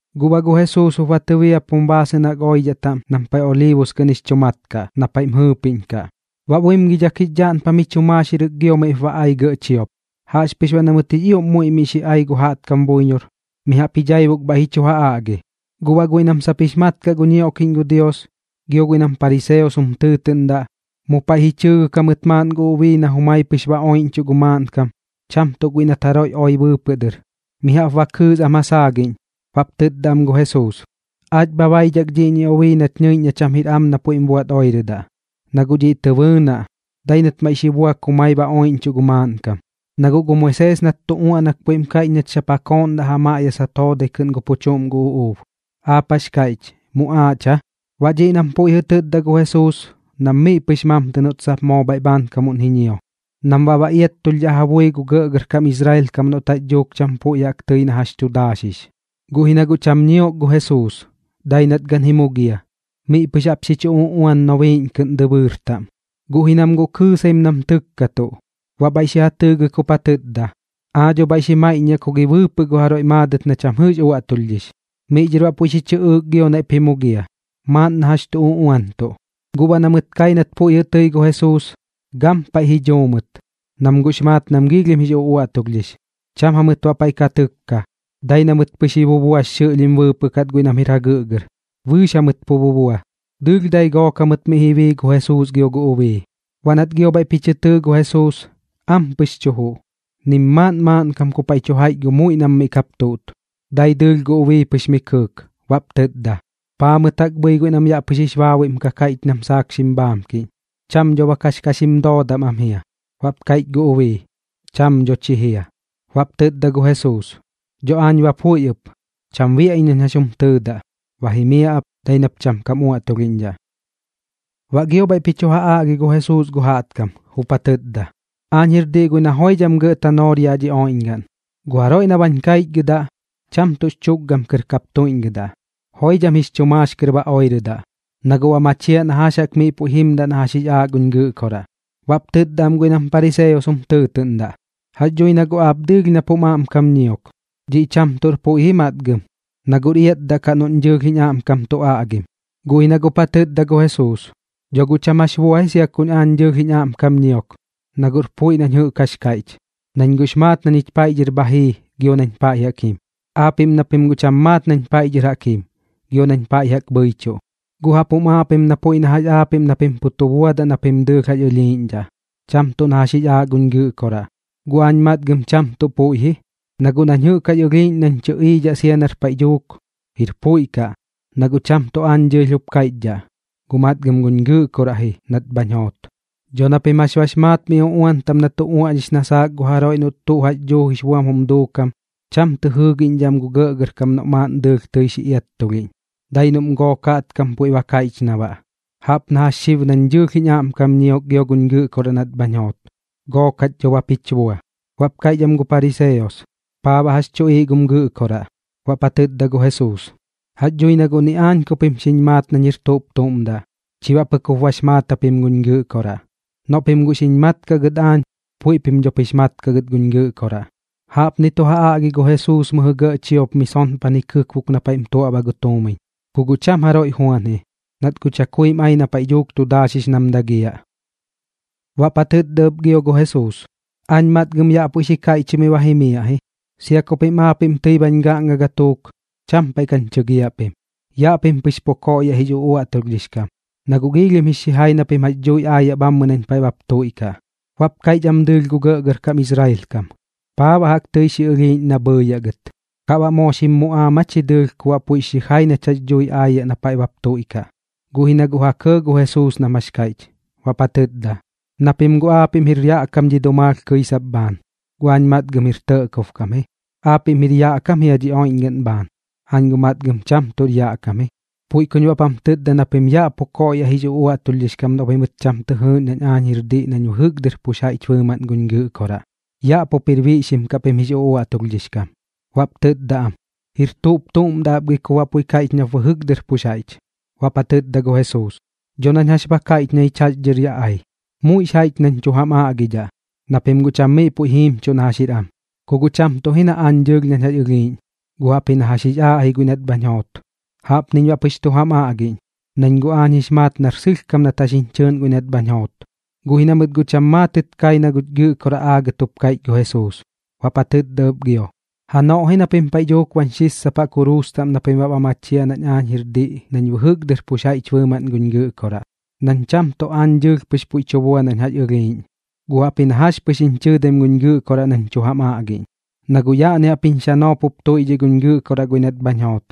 Guꞌ baꞌ gu Jesuus jup ba tɨbiapum baasɨꞌn jaꞌk oidhaꞌ taꞌm nam paiꞌ Oliibus kɨꞌn jix chu mat kaꞌ, na paiꞌm jɨɨpiꞌñkaꞌ. Baꞌ buimgidhak jix dhaꞌnpam jix chu maaxirɨk giop miꞌp ba ai gɇꞌ chiop. Jaꞌxpɨx baꞌ na mɨt jix ioꞌm muiꞌ miꞌ xi ai gu jaꞌtkam buiñor, mi jaꞌp ji dhaibuk bhaiꞌ ji chu ja aꞌgi. Guꞌ baꞌ guiꞌ nam sap jix mat kaꞌ gu ñioꞌkiꞌñ gu Dios, gio guiꞌ nam pariseos jum tɨɨtɨꞌndaꞌ, mu paiꞌ ji chɨɨgɨk jamɨt maaꞌn gu ubii na jumai pɨx ba oiꞌñchuꞌ gu maaꞌnkam, cham tuꞌ guiꞌ nat jaroiꞌ oi bɨɨpɨꞌ dɨr. Mi jaꞌp ba kɨɨs am ja saagiꞌñ, baꞌp tɨtda am gu Jesuus: ―Aach bha baidhak dhiꞌñi ubii nach ñɨiꞌñ na cham jir am na puiꞌm buaꞌt oirɨdaꞌ. Na guꞌ dhiꞌ tɨ bɨɨnaꞌ, dai nat maiꞌ xi buak jumai ba oiꞌñchuꞌ gu maaꞌnkam. Na guꞌ gu Moisees nat tu uaꞌnak puiꞌm kaiꞌch nach sap ja kooꞌndaꞌ ja maꞌyasat joodai kɨꞌn gu pu chuꞌm gu uꞌuub. ¿Aap jax kaiꞌch, muꞌaaꞌch aa? Baꞌ dhiꞌ nam puiꞌ jɨꞌ tɨtda gu Jesuus nam miꞌ pɨx mamtɨ noꞌt sap moo bhaiꞌ bhaankamuꞌn ji ñio, nam baꞌ ba iattulhdhaꞌ ja bui gu gɇꞌgɇrkam Israel kam noꞌt jax dhuuk cham puiꞌ jaꞌk tɨi na jax tu daaxix. Guꞌ ji na guꞌ cham ñiok gu Jesuus, dai nat gan ji mugia, miꞌ pɨx jaꞌp xi chu uꞌuan nobiiꞌñ kɨꞌn dɨbɨɨr taꞌm. Guꞌ ji nam guꞌ kɨɨsaim nam tɨkkatuꞌ. Baꞌ bhaiꞌ xi ja tɨɨgɨk jup ja tɨtda: ―Aa dho bhaiꞌ xi maiꞌññaꞌ ku gi bɨɨpɨꞌ gu jaroiꞌ maadɨt na cham jɨꞌx uaꞌtulhdhix. Miꞌ dhɨr baꞌ puiꞌ xi chɨꞌɨɨk gio naiꞌp ji mugia, maaꞌn na jax tu uꞌuantuꞌ. Guꞌ baꞌ na mɨt kai nat puiꞌ jɨꞌ tɨi gu Jesuus, gampaiꞌ ji dhuu mɨt, nam guꞌx maat nam giilhim jix uꞌuaꞌtulhdhix. Cham jamɨt baꞌ paiꞌ ka tɨkka, dai na mɨt pɨx ji bubuax xɨꞌlhim bɨɨpɨꞌ kat guiꞌ nam jir jagɨꞌgɨr. Bɨɨx jamɨt pu bubua, dɨɨlh dai gook jamɨt miꞌ ji bii gu Jesuus gio gu ubii. Baꞌ nat gio bhaiꞌp ji chɨ tɨɨ gu Jesuus, ampɨx tu juꞌ, nim maaꞌn maaꞌnkam ku paiꞌ tu jaiꞌch gu muiꞌ nam miꞌ kap tuꞌt, dai dɨɨlh gu ubii pɨx miꞌ kɨɨk. Baꞌp tɨtda: ―¿Paa mɨt jaꞌk bhɨi guiꞌ nam yaꞌ pɨx jix baabuiꞌm ka kaiꞌch nam saak xim bhaamkiꞌñ? Cham dho bak jax ka xim doodam am jia. Baꞌp kaiꞌch gu ubii: ―Cham dho chi jia. Baꞌp tɨtda gu Jesuus: ―Dho aañ ba puiꞌ ɨp, cham biaꞌ iñ nañ jax jum tɨɨdaꞌ. Ba jimiaꞌ ap, dai nap cham kam uaꞌtulhiꞌñdhaꞌ. Baꞌ gio bhaiꞌp ji chu ja aꞌgi gu Jesuus gu jaꞌtkam, jup ja tɨtda: ―Aañ jir diꞌ guiꞌ na joidham gɇꞌ tanoor yaꞌ dhi oiꞌñgaꞌn. Gu jaroiꞌ na bañ kaichgɨdaꞌ, cham tuꞌx chukgam kɨr kap tuiꞌñgɨdaꞌ. Joidham jix chu maax kɨr ba oirɨdaꞌ, na guꞌ ba machiaꞌ na jax jaꞌk miꞌ puiꞌ jimdaꞌ na jax jix aaꞌ guñ Gɨꞌkoraꞌ. Baꞌp tɨtda am guiꞌ nam pariseos jum tɨɨtɨꞌndaꞌ: ―Jax dhui na guꞌ aap dɨɨlh nap jum aꞌmkam ñiok. Dhiꞌ cham tuꞌr puiꞌ ji matgam, na guꞌr iatdaꞌ kaꞌ noꞌñ dɨɨlh jiñ aꞌmkam tu aꞌgim. Guꞌ ji na guꞌp ja tɨtda gu Jesuus: ―Dho guꞌ cham jax bua ji sia kuñ dɨɨlh jiñ aꞌmkam ñiok, na guꞌr puiꞌ nañ jɨꞌk jax kaiꞌch, nañ guꞌx maat na ñich paiꞌ dhɨr bha jii gio nañ pa jaꞌk jim. Aapiꞌm na pim guꞌ cham maat nañ paiꞌ dhɨr jaꞌk jim gio nañ pa jaꞌk bhɨichuꞌ. Guꞌ jaꞌp jum aaꞌ pim na puiꞌ na jax aapiꞌm na pim pu tu buadaꞌ na pim dɨɨlh jax ɨlhiiꞌñdhaꞌ, cham tuꞌ na jax jix aaꞌ guñ Gɨꞌkoraꞌ. Guꞌ aañ matgam cham tuꞌ puiꞌ ji, na guꞌ nañ jɨꞌk jax ɨlhiiꞌñ nañ tɨꞌiidhaꞌ sia nar paiꞌ dhuuk, jir puiꞌ kaꞌ, na guꞌ cham tuꞌ aañ dɨɨlh jup kaiꞌchidhaꞌ, guꞌ matgam guñ Gɨꞌkoraꞌ ji nat bhañ joot. Dho na pim jax bax maat mi uꞌuan taꞌm na tu uaꞌñix na saak gu jaroiꞌ noꞌt tuꞌ jax dhuu jix buam jum duukam, cham tɨ jɨɨgiꞌñdhaꞌ am gu gɇꞌgɇrkam noꞌ maaꞌn dɨɨlh tɨi xi iattulhiꞌñ, dai noꞌm gook jaꞌtkam puiꞌ ba kaiꞌch na baꞌ. Jaꞌp na jax xib nañ dɨɨlh jiñ aꞌmkam ñiok gio guñ Gɨꞌkoraꞌ nat bhañ joot, gook jach dho bap jich bua. Baꞌp kaiꞌch am gu pariseos: ―¿Paa baꞌ jax chuꞌiiꞌ gum Gɨꞌkoraꞌ? Baꞌp ja tɨtda gu Jesuus: ―Jax dhui na guꞌ ni aañ ku pim xiñ maat nañ jir tuꞌp tuꞌm daꞌ, chi baꞌ pɨk jup bax maat japim guñ Gɨꞌkoraꞌ. Noꞌ pim guꞌ xiñ maat kaꞌ gɨt aañ, puiꞌ pim dhop jix maat kaꞌ gɨt guñ Gɨꞌkoraꞌ. Jaꞌpni tu ja aꞌgi gu Jesuus mɨjɨ gɇꞌ chiop mi sonpan ji kɨkbuk na paiꞌm tuaꞌbaꞌ gu tuumiñ. Ku guꞌ cham jaroiꞌ juan ji, nat guꞌ chakuim ai na paiꞌ dhuuk tu daaxix nam dagiaꞌ. Baꞌp ja tɨtda ɨp gio gu Jesuus: ―Aañ matgam yaꞌ puiꞌ xi kaiꞌchimɨi ba jimiaꞌ ji. Sia ku pim aapiꞌm tɨi bañ gaꞌnga gatuuk, cham paiꞌ kañ chɨgiaꞌ pim. Yaꞌ pim pɨx pu koꞌyaꞌ jix uꞌuaꞌtulhdhix kam, na guꞌ giilhim jix xijai na pim jax dhui aayaꞌ bhammɨ nañ paiꞌ bap tuiꞌkaꞌ. Baꞌp kaiꞌch am dɨɨlh gu gɇꞌgɇrkam Israel kam: ―¿Paa baꞌ jaꞌk tɨi xi ɨlhiiꞌñ na bhɨɨyaꞌ gɨt? ¿Kaꞌ baꞌ moo xim muꞌaam aa chi dɨɨlh ku baꞌ puiꞌx xijai nach jax dhuuji aayaꞌ na paiꞌ bap tuiꞌkaꞌ? Guꞌ ji na guꞌ ja kɇɇ gu Jesuus nam jax kaiꞌch, baꞌp ja tɨtda: ―Na pim guꞌ aapiꞌm jir yaꞌ kam dhi dumaalh kɨisap bhaan, guꞌ aañ matgam jir tɇꞌkob kam ji. Aapiꞌm jir yaꞌ kam jia dhi oiꞌñgaꞌn bhaan, aañ guꞌ matgam cham tuꞌr yaꞌ kam ji. Puiꞌ kuñ baꞌp jam tɨtda na pim yaꞌ pu koꞌyaꞌ jix uꞌuaꞌtulhdhix kam noꞌ pimɨt cham tɨ jɨɨꞌñ nañ aañ jir diꞌ nañ bɨjɨk dɨr pux jaiꞌch bɨɨmaꞌn guñ Gɨꞌkoraꞌ. Yaꞌ pup jir biꞌxim kaꞌ pim jix uꞌuaꞌtulhdhix kam. Baꞌp tɨtda am: ―¿Jir tuꞌp tuꞌm daꞌ ap gi nap baꞌ puiꞌ kaiꞌch nap bɨjɨk dɨr pux jaiꞌch? Baꞌp ja tɨtda gu Jesuus: ―Dho nañ jax ba kaiꞌch na ñich jax dhɨr yaꞌ ai. Muiꞌx jaiꞌch nañ tuꞌ tu jam aꞌgidhaꞌ, na pim guꞌ cham miꞌ puiꞌ jiimchuꞌ na jax jir am. Ku guꞌ cham tuꞌ ji na aañ dɨɨlh nañ jax ɨlhiiꞌñ, gu jaꞌpji na jax jix aaꞌ guiꞌ nat bhañ joot. Jaꞌpniñ baꞌ pɨx tu jam aꞌgiꞌñ, nañ guꞌ aañ jix maat nar sɨlhkam nat jax jiñ chɨɨꞌn guiꞌ nat bhañ joot. Guꞌ ji na mɨt guꞌ cham maatɨt kai na guch Gɨꞌkoraꞌ aagɨt jup kaiꞌch gu Jesuus. Baꞌp ja tɨtda ɨp gio: ―Janoꞌ ji na pim paiꞌ dhuuk bañ xissapaꞌ kuruus taꞌm na pim baꞌ ba machiaꞌ nañ aañ jir diꞌ nañ bɨjɨk dɨr pux jaiꞌch bɨɨmaꞌn guñ Gɨꞌkoraꞌ, nañ cham tuꞌ aañ dɨɨlh pɨx puiꞌ tu bua nañ jax ɨlhiiꞌñ, guꞌ jaꞌpji na jax pɨx jiñ chɨɨdaim ji guñ Gɨꞌkoraꞌ nañ tu jam aꞌgiꞌñ. Na guꞌ yaꞌni jaꞌp jiñ xanoop jup tuiꞌdhiꞌ guñ Gɨꞌkoraꞌ guiꞌ nat bhañ joot.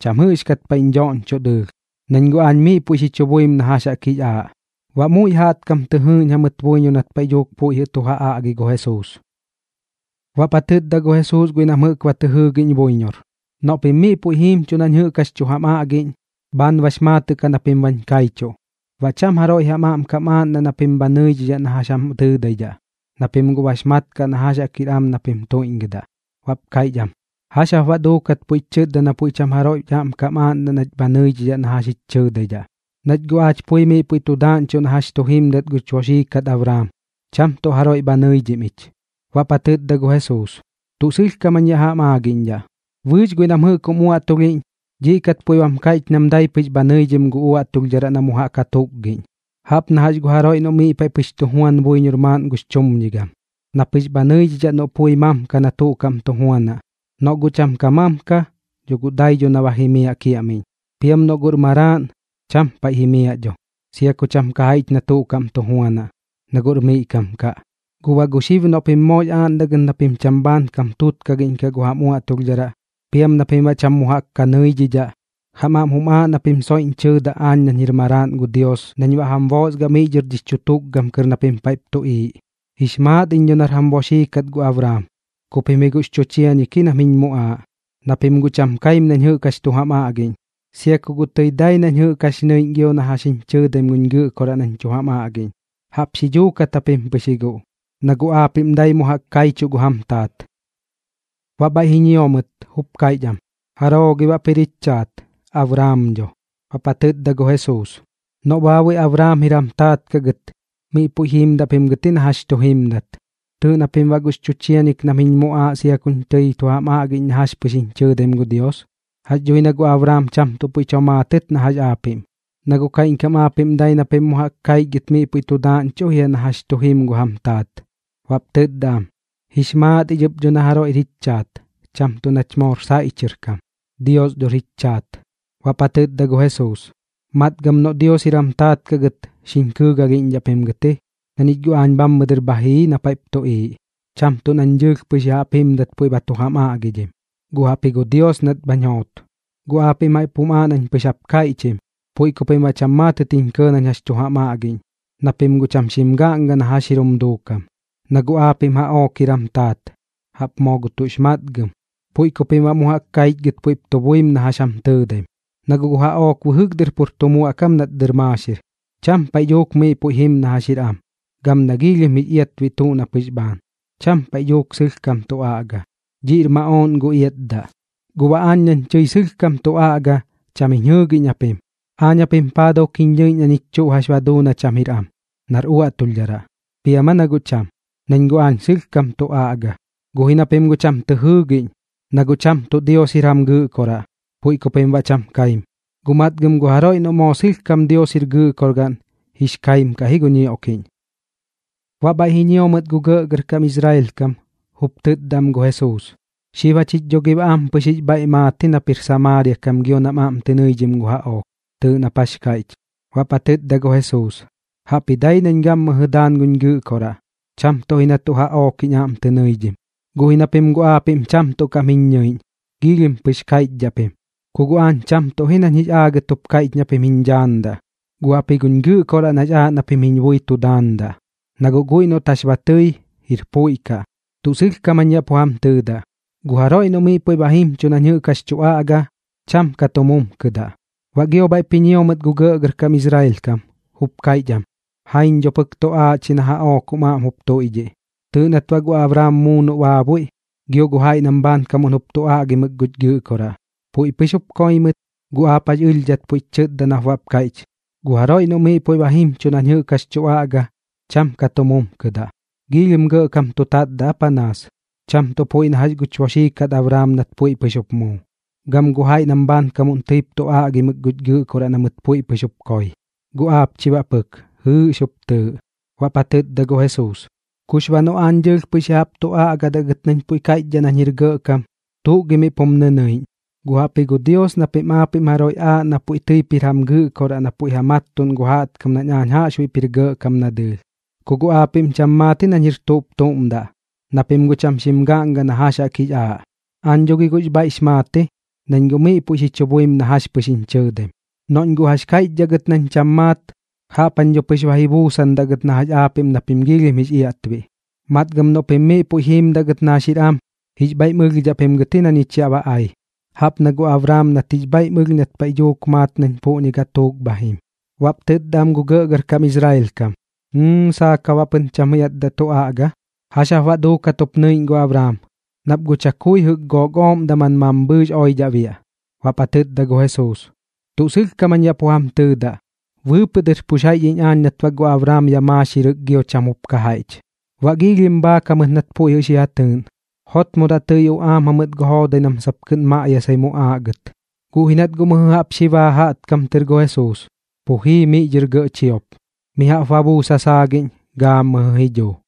Cham jɨꞌxkat paiꞌñ dhoꞌñchoꞌ dɨɨlh, nañ guꞌ aañ miꞌ puiꞌ xi chu buim na jax jaꞌk jix aaꞌ. Baꞌ muiꞌ jaꞌtkam tɨ jɨɨꞌñ jamɨt buiñor nat paiꞌ dhuuk puiꞌ jɨꞌ tu ja aꞌgi gu Jesuus. Baꞌp ja tɨtda gu Jesuus guiꞌ nam jɨꞌk ba tɨ jɨɨgiꞌñ buiñor: ―Noꞌ pim miꞌ puiꞌ jiimchuꞌ nañ jɨꞌk jax tu jam aꞌgiꞌñ, bhaan bax maatɨꞌ kaꞌ na pim bañ kaichuꞌ. Baꞌ cham jaroiꞌ jam aꞌmkam aaꞌndaꞌ na pim bha nɨidhidhaꞌ na jax jam tɨɨdaidhaꞌ, na pim guꞌ bax mat kaꞌ na jax jaꞌk jir am na pim tuiꞌñgɨdaꞌ. Baꞌp kaiꞌch am: ―¿Jax jap baꞌ duukat puiꞌch chɨtda na puiꞌ cham jaroiꞌ jich aꞌmkam aaꞌndaꞌ nach bha nɨidhidhaꞌ na jax jich chɨɨdaidhaꞌ? Nach guꞌ aach pui miꞌ puiꞌ tu daaꞌñchuꞌ na jax tu jimdat guch boxii kat Abraam, cham tuꞌ jaroiꞌ bha nɨidhim ich. Baꞌp ja tɨtda gu Jesuus: ―Tuꞌ sɨlhkam jañ yaꞌ jam aagiꞌñdhaꞌ, bɨɨx guiꞌ nam jɨꞌk jum uaꞌtulhiꞌñ, dhiꞌ kat puiꞌ bam kaiꞌch nam dai pɨx bha nɨidhim gu uaꞌtulhdharaꞌ na mu jaꞌk ja tukgiꞌñ. Jaꞌp na jax gu jaroiꞌ noꞌ miꞌ paiꞌ pɨx tu juan buiñor maaꞌn gux chumñigam, na pɨx bha nɨidhidhaꞌ noꞌ pui mamka na tuꞌ kaꞌm tu juanaꞌ. Noꞌ guꞌ cham ka mamka, dho guꞌ dai dho na ba jimiaꞌ kiaꞌmiꞌñ. Piam noꞌ guꞌr maraaꞌn, cham paiꞌ jimiaꞌ dho, sia ku cham ka jaiꞌch na tuꞌm kaꞌm tu juanaꞌ, na guꞌr miꞌ kam kaꞌ. Guꞌ baꞌ gu xib noꞌ pim moox aaꞌndaꞌ gɨt na pim cham bhaan kam tutkagiꞌñkaꞌ gu jam uaꞌtulhdharaꞌ, piam na pim baꞌ cham mu jaꞌk ka nɨidhidhaꞌ, jam aꞌm jum aaꞌ na pim soiꞌñ chɨɨdaꞌ aañ nañ jir Maraaꞌn gu Dios nañ baꞌ jam boosgaꞌ miꞌ dhɨr jix chu tukgam kɨr na pim paiꞌp tuꞌiiꞌ. Jix maat iñ dho nar jam boxii kat gu Abraam, ku pim ji guꞌx chu chiañik ji nam jiñ muꞌaaꞌ, na pim guꞌ cham kaim nañ jɨꞌk jax tu jam aꞌgiꞌñ. Sia ku tɨi dai nañ jɨꞌk jax nɨiꞌñ gio na jax jiñ chɨɨdaim guñ Gɨꞌkoraꞌ nañ tu jam aꞌgiꞌñ, jaꞌp xi dhuukat japim pɨx ji guꞌ, na guꞌ aapiꞌm dai mu jaꞌk kaichuꞌ gu jam taat. Baꞌ bhaiꞌ ji ñio mɨt, jup kaiꞌch am: ―¿Jaroo gi baꞌp jir jich chaat? Abraam dho. Baꞌp ja tɨtda gu Jesuus: ―Noꞌ baabuiꞌ Abraam jir jam taat kaꞌ gɨt, miꞌ puiꞌ jiimdaꞌ pim gɨt ji na jax tu jimdat. Tɨɨꞌ na pim baꞌ guꞌx chu chiañik nam jiñ muꞌaaꞌ sia kuñ tɨi tu aꞌgim na jax pɨx jiñ chɨɨdaim gu Dios. Jax dhui na guꞌ Abraam cham tuꞌ puiꞌ tomaatɨt na jax aapiꞌm. Na guꞌ kaiꞌñkam aapiꞌm dai na pim mu jaꞌk kaichgɨt miꞌ puiꞌ tu daaꞌñchuꞌ jia na jax tu jim gu jam taat. Baꞌp tɨtda am: ―Jix maat ich dho ɨp na jaroiꞌr jich chaat, cham tuꞌ nach moor saiꞌ chɨr kam. Dios dhor jich chaat. Baꞌp ja tɨtda gu Jesuus: ―Matgam noꞌ Dios jir jam taat kaꞌ gɨt, xiñ kɨɨgalhiꞌñdhaꞌ pim gɨt ji, na ñich guꞌ aañ bhammɨ dɨr bha jii na paiꞌp tuꞌiiꞌ. Cham tuꞌ nañ dɨɨlh pɨx ya jaꞌp jimdat puiꞌ ba tu jam aꞌgidhim, guꞌ jaꞌpji gu Dios nat bhañ joot. Guꞌ aapiꞌm jaꞌp jum aaꞌ nañ pɨx jap kaiꞌchim, puiꞌ ku pim baꞌ cham maatɨt jiñ kɇɇ nañ jax tu jam aꞌgiꞌñ, na pim guꞌ cham xim gaꞌnga na jax jir jum duukam. Na guꞌ aapiꞌm jaꞌook jir jam taat, jaꞌp moo gu tuꞌx matgam, puiꞌ ku pim baꞌ mu jaꞌk kaichgɨt puiꞌp tu buim na jax jam tɨɨdaim. Na guꞌ gu jaꞌook bɨjɨk dɨr pur tu muaꞌkam nat dɨr maaxir, cham paiꞌ dhuuk miꞌ puiꞌ jim na jax jir am, gam na giilhim jix iatbiꞌ tuꞌ na pɨx bhaan. Cham paiꞌ dhuuk sɨlhkam tu aꞌga, dhiꞌr maꞌooꞌn gu iatdaꞌ. Guꞌ baꞌ aañ nañ tɨi sɨlhkam tu aꞌga, cham jiñ jɨɨgiꞌñ japim. ¿Aañ japim paa duuk jiñ ñɨiꞌñ na ñich tuꞌ jax ba duu na cham jir am, nar uaꞌtulhdharaꞌ? ¿Piam aa na guꞌ cham? Nañ guꞌ aañ sɨlhkam tu aꞌga, guꞌ ji na pim guꞌ cham tɨ jɨɨgiꞌñ. Na guꞌ cham tuꞌ Dios jir jam Gɨꞌkoraꞌ, puiꞌ ku pim baꞌ cham kaim. Guꞌ matgam gu jaroiꞌ noꞌ moo sɨlhkam Dios jir Gɨꞌkorgaꞌn, jix kaim kaꞌ ji gu ñioꞌkiꞌñ. Baꞌ bhaiꞌ ji ñio mɨt gu gɇꞌgɇrkam Israel kam, jup tɨtda am gu Jesuus: ―Xib jachich dho gi baꞌ ampɨx jix bhaiꞌ maat ji nap jir Samaaria kam gio nam aꞌm tɨ nɨidhim gu jaꞌook. Tɨɨꞌ nap jax kaiꞌch. Baꞌp ja tɨtda gu Jesuus: ―Jaꞌpji dai nañ gammɨjɨ daan guñ Gɨꞌkoraꞌ, cham tuꞌ ji na tuꞌ jaꞌook jiñ aꞌm tɨ nɨidhim. Guꞌ ji na pim guꞌ aapiꞌm cham tuꞌ kaꞌm jiñ ñɨiꞌñ, giilhim pɨx kaiꞌchdhaꞌ pim. Ku guꞌ aañ cham tuꞌ ji nañ jix aagɨt jup kaiꞌch na pim jiñ dhaandaꞌ, guꞌ jaꞌpji guñ Gɨꞌkoraꞌ nax aaꞌ na pim jiñ bui tu daandaꞌ, na guꞌ guiꞌ noꞌt jax ba tɨi, jir puiꞌ kaꞌ. Tuꞌ sɨlhkam jañ yaꞌ pu jam tɨɨdaꞌ, gu jaroiꞌ noꞌ miꞌ puiꞌ ba jimchuꞌ nañ jɨꞌk jax tu aꞌga, cham ka tu mumkɨdaꞌ. Baꞌ gio bhaiꞌp ji ñio mɨt gu gɇꞌgɇrkam Israel kam, jup kaiꞌch am: ―¡Jaiñ dho pɨk tuꞌ aaꞌch ji na jaꞌook jum aꞌm jup tuiꞌdhiꞌ! Tɨɨꞌ nat baꞌ gu Abraam muu noꞌ baabuiꞌ, gio gu jaiꞌ nam bhaankamuꞌn jup tu aꞌgimɨk guch Gɨꞌkoraꞌ. Puiꞌ pɨx jup koi mɨt, guꞌ aap jax ɨlhdhat puiꞌch chɨtda nap baꞌp kaiꞌch: “Gu jaroiꞌ noꞌ miꞌ puiꞌ ba jimchuꞌ nañ jɨꞌk jax tu aꞌga, cham ka tu mumkɨdaꞌ.” ¿Giilhim gɇꞌkam tu tatdaꞌ aa panaas? Cham tuꞌ puiꞌ na jax guch boxii kat Abraam nat puiꞌ pɨx jup muu, gam gu jaiꞌ nam bhaankamuꞌn tɨip tu aꞌgimɨk guch Gɨꞌkoraꞌ na mɨt puiꞌ pɨx jup koi. Guꞌ aap chi baꞌ pɨk, jɨɨꞌx jup tɨɨꞌ. Baꞌp ja tɨtda gu Jesuus: ―Kux baꞌ noꞌ guꞌ aañ dɨɨlh pɨx ya jaꞌp tu aꞌgadaꞌ gɨt nañ puiꞌ kaiꞌchdhaꞌ nañ jir gɇꞌkam, ¿tuꞌ gi miꞌp jum nɨnɨiꞌñ? Guꞌ jaꞌpji gu Dios na pim aapiꞌm jaroiꞌ aaꞌ na puiꞌ tɨip jir jam Gɨꞌkoraꞌ na puiꞌ ja mattuꞌn gu jaꞌtkam nañ jaꞌxbuiꞌp jir gɇꞌkam na dɨɨlh. Ku guꞌ aapiꞌm cham maat ji nañ jir tuꞌp tuꞌm daꞌ, na pim guꞌ cham xim gaꞌnga na jax jaꞌk jix aaꞌ. Aañ dho gi guꞌx bhaiꞌx maat ji, nañ guꞌ miꞌ puiꞌ tu buim na jax pɨx jiñ chɨɨdaim. Noꞌñ guꞌ jax kaiꞌchdhaꞌ gɨt nañ cham maat, jaꞌp dho pɨx ba ji buusandaꞌ iñ gɨt na jax aapiꞌm na pim giilhim jix iatbiꞌ. Matgam noꞌ pim miꞌ puiꞌ jiimdaꞌ gɨt na jax jir am, jix bhaiꞌm ɨlhdhaꞌ pim gɨt ji na ñich yaꞌ ba ai, jaꞌp na gu Abraam nat jix bhaiꞌm ɨlh nat paiꞌ dhuuk maat nañ puꞌñi gatuuk bha jim. Baꞌp tɨtda am gu gɇꞌgɇrkam Israel kam: ―¡Jɨɨ, saak jap baꞌ pɨn cham iatdaꞌ tu aꞌga! ¿Jax jap baꞌ duukat jup nɨiꞌñ gu Abraam? Nap guꞌ chakui jɨꞌk gook ooꞌm daman mambhɨɨx oidhaꞌ biaꞌ. Baꞌp ja tɨtda gu Jesuus: ―Tuꞌ sɨlhkam jañ yaꞌ pu jam tɨɨdaꞌ, bɨɨpɨꞌ dɨr pux jaiꞌch iñ aañ nat baꞌ gu Abraam yaꞌ maaxirɨk gio cham jup ka jaiꞌch. Baꞌ giilhim bhaak jamɨt nat puiꞌ xi ja tɨɨꞌn. Jotmodaꞌ tɨi uꞌaam jamɨt gu joodai nam sap kɨꞌn maꞌyasai muꞌaaꞌ gɨt. Guꞌ ji nat guꞌ mɨjɨ jaꞌp xi baa jaꞌtkam tɨr gu Jesuus, pu jii miꞌ dhɨr gɇꞌ chiop. Mi jaꞌp ba buus ja saagiꞌñ, gammɨjɨ ji dhuu.